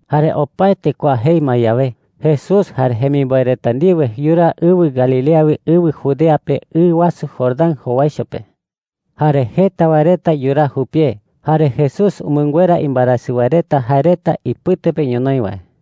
Jare opaete kua jei ma yawe, Jesús jare jemimboe reta ndiwe yuraa ɨwɨ Galilea wi ɨwɨ Judea pe, ɨ wasu Jordán jowaicho pe. Jare jeta wae reta yuraa jupie. Jare Jesús umɨnguera imbaerasɨ wae reta jae reta ipɨte pe ñonoï wae.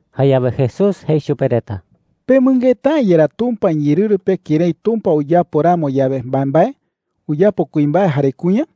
Jayawe Jesús jei chupe reta: “¿Pemɨngeta’ä yerá Tumpa iñeerɨru pe kërái Tumpa uyapo ramo yawe mbaembae, uyapo kuimbae jare kuña?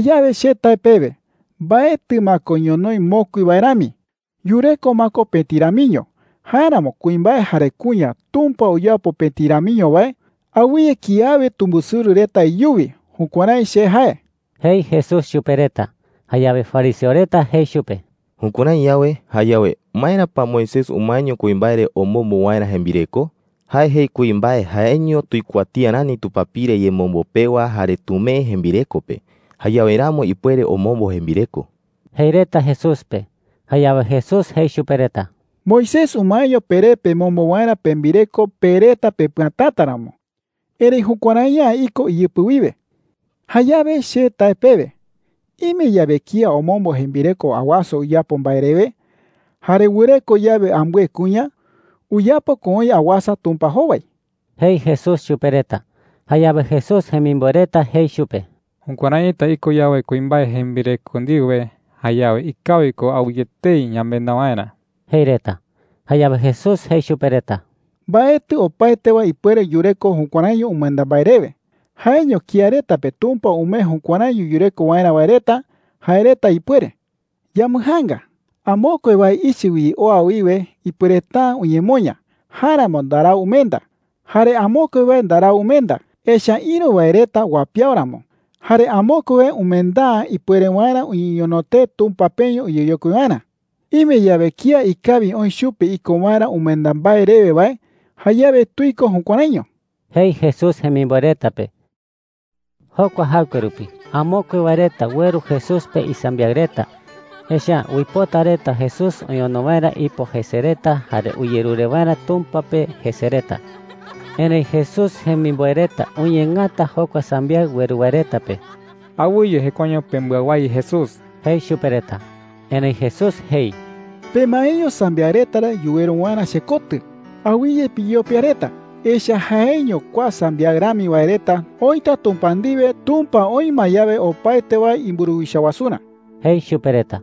“Jayawe che tae pewe, mbaetɨ ma ko ñonoï mokui wae rami. Yureko ma ko pëti ramiño. Jáeramo kuimbae jare kuña Tumpa uyapo pëti ramiño wae, awɨye kiawe tumbɨsɨrɨ reta iyuwi. Jukuärái che jae,” jei Jesús chupe reta. Jayawe fariseo reta jei chupe: “Jukuärái yawe, jayawe ¿maera pa Moisés umaeño kuimbae re omombo waerä jembireko? Jae jei kuimbae jaeño tuikuatía rani tupapire yemombo pewa jare tumee jembireko pe. Jayawe ramo ipuere omombo jembireko,” jei reta Jesús pe. Jayawe Jesús jei chupe reta: “Moisés umaeño peré pemombo waerä pembireko pe reta pepɨatäta ramo. Erëi jukuärai’ä iko iyɨpɨ wiwe,” jei. “Jayawe che tae pewe, ime yawe kía omombo jembireko awasa uyapo mbae rewe, jare wɨreko yawe ambɨe kuña, uyapo ko oï awasa Tumpa jowai,” jei Jesús chupe reta. Jayawe Jesús jemimboe reta jei chupe: “Jukuäraita iko yawe kuimbae jembireko ndiwe, jayawe ikawi ko awɨye etei yamenda waerä,” jei reta. Jayawe Jesús jei chupe reta: “Mbaetɨ opaete wae ipuere yureko jukuäraiño umenda mbae rewe – jaeño kía reta pe Tumpa umee jukuäraiño yureko waerä wae reta, jae reta ipuere,” jei. “Yambɨjaanga. Amokue wae ichɨ wi oa wiwe ipuereta’ä uñemoña. Jáeramo ndarau umenda. Jare amokue wae ndarau umenda, echa’ä ïru wae reta uapiawo ramo. Jare amokue wae umenda’ä ipuere waerä uñeñono tee Tumpa peño uyeyokui waerä,” jei. “Ime yawe kía ikawi oï chupe iko waerä umenda mbae rewe wae, jayawe tuiko jukuäraiño,” jei Jesús jemimboe reta pe. Jokua jaɨkue rupi amokue wae reta ueru Jesús pe isambiaɨ reta. Echa’ä uipota reta Jesús oñono waerä ipo jese reta jare uyerure waerä Tumpa pe jese reta. Erëi Jesús jemimboe reta uñeengata jokua sambiaɨ ueru wae reta pe. “Awɨye jekuaeño pembɨawái Jesús,” jei chupe reta. Erëi Jesús jei: “Pemaeño sambiaɨ reta re yuweru waerä chekotɨ. Awɨye piyopia reta, echa’ä jaeño kua sambiaɨ rami wae reta oïta Tumpa ndiwe, Tumpa oï ma yawe opaete wae imburuwicha wasurä,” jei chupe reta.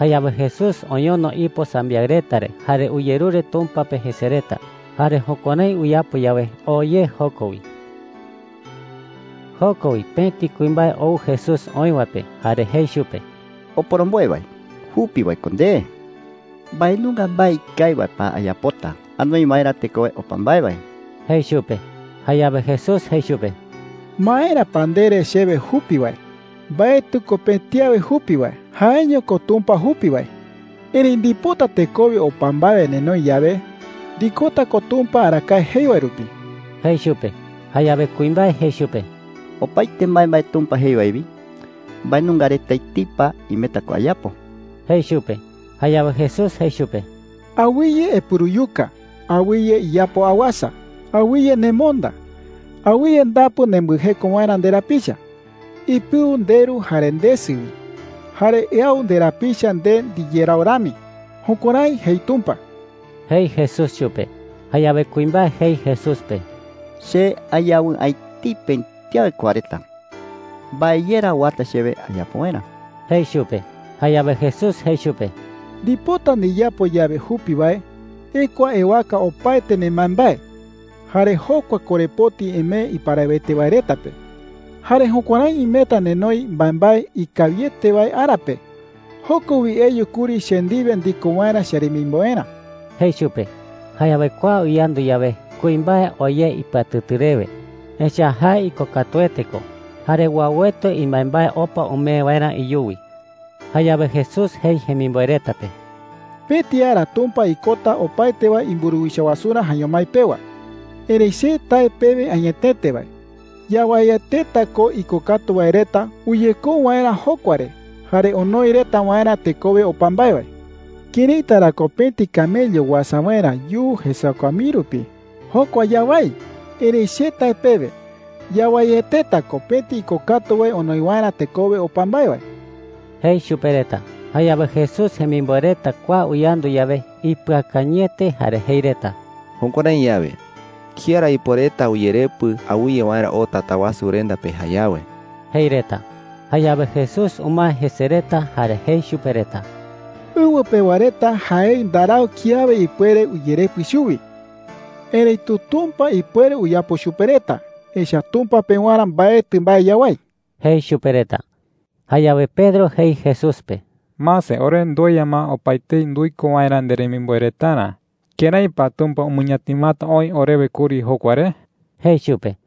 Jayawe Jesús oñono ipo sambiaɨ reta re jare uyerure Tumpa pe jese reta. Jare jukuärái uyapo yawe, oo ye joko wi. Joko wi pëti kuimbae ou Jesús oï wae pe jare jei chupe: “Oporomboe wae, jupi wae ko nde,” jei chupe. “¿Mbae nunga mbae ikawi wae pa ayapota anoi waerä tekowe opa mbae wae?” jei chupe. Jayawe Jesús jei chupe: “¿Maera pa ndere chewe jupi wae? Mbaetɨ ko pëti awe jupi wae. Jaeño ko Tumpa jupi wae,” jei. “Erëi ndipota tekowe opa mbae wae nenoi yawe, ndikota ko Tumpa arakae jei wae rupi,” jei chupe. Jayawe kuimbae jei chupe: “Opaete mbaembae Tumpa jei wae wi, ¿mbae nunga reta etei pa imeta ko ayapo?” jei chupe. Jayawe Jesús jei chupe: “Awɨye epuruyuka. Awɨye iyapo awasa. Awɨye nemonda. Awɨye ndapu nembɨjeko waerä nderapicha. Ipɨu nderu jare ndesɨ wi. Jare eau nderapicha nde ndiyerau rami. Jukuärái jei Tumpa,” jei Jesús chupe. Jayawe kuimbae jei Jesús pe: “Che ayawɨ'ä etei pëti awe kua reta. ¿Mbae ye ra uata chewe ayapo waerä?” jei chupe. Jayawe Jesús jei chupe: “Ndipota ndiyapo yawe jupi wae, ekua ewaka opaete nembaembae, jare jokua korepoti emee iparawete wae reta pe. Jare jukuärái imeta nenoi mbaembae ikawiete wae ara pe. Joko wi eyu kuri che ndiwe ndiko waerä cheremimboerä,” jei chupe. Jayawe kua uyandu yawe, kuimbae oo ye ipɨatɨtɨ rewe. Echa’ä jae ikokatuete ko jare uauete imbaembae opa umee waerä iyuwi. Jayawe Jesús jei jemimboe reta pe: “Pëti ara Tumpa ikota opaete wae imburuwicha wasurä jaeño mái pewa. Erëi che tae pewe añetete wae, yawaieteta ko ikokatu wae reta uyekou waerä jokua re jare onoi reta waerä tekowe opa mbae wae,” jei. “¿Këraita ra ko pëti camello Pëti camello tuichaete kawayu wi. uasa waerä yuu jesakua mii rupi? Jokua yawái. Erëi che tae pewe, yawaieteta ko pëti ikokatu wae onoi waerä tekowe opa mbae wae,” jei chupe reta. Jayawe Jesús jemimboe reta kua uyandu yawe, ipɨakañɨete jare jei reta: “Jukuärái yawe, ¿kía ra ipuereta uyerepɨ awɨye waerä oo Tatawasurenda pe jayawe?” jei reta. Jayawe Jesús umae jese reta, jare jei chupe reta: “Ɨwɨ pewa reta jaei ndarau kiawe ipuere uyerepɨ chuwi. Erëitu Tumpa ipuere uyapo chupe reta, echa’ä Tumpa pewarä mbaetɨ mbae yawái,” jei chupe reta. Jayawe Pedro jei Jesús pe: “Mase, ore ndueya ma opaetei nduiko waerä nderemimboe retarä. ¿Kërái pa Tumpa umɨñatimata oï orewe kuri jokua re?” jei chupe.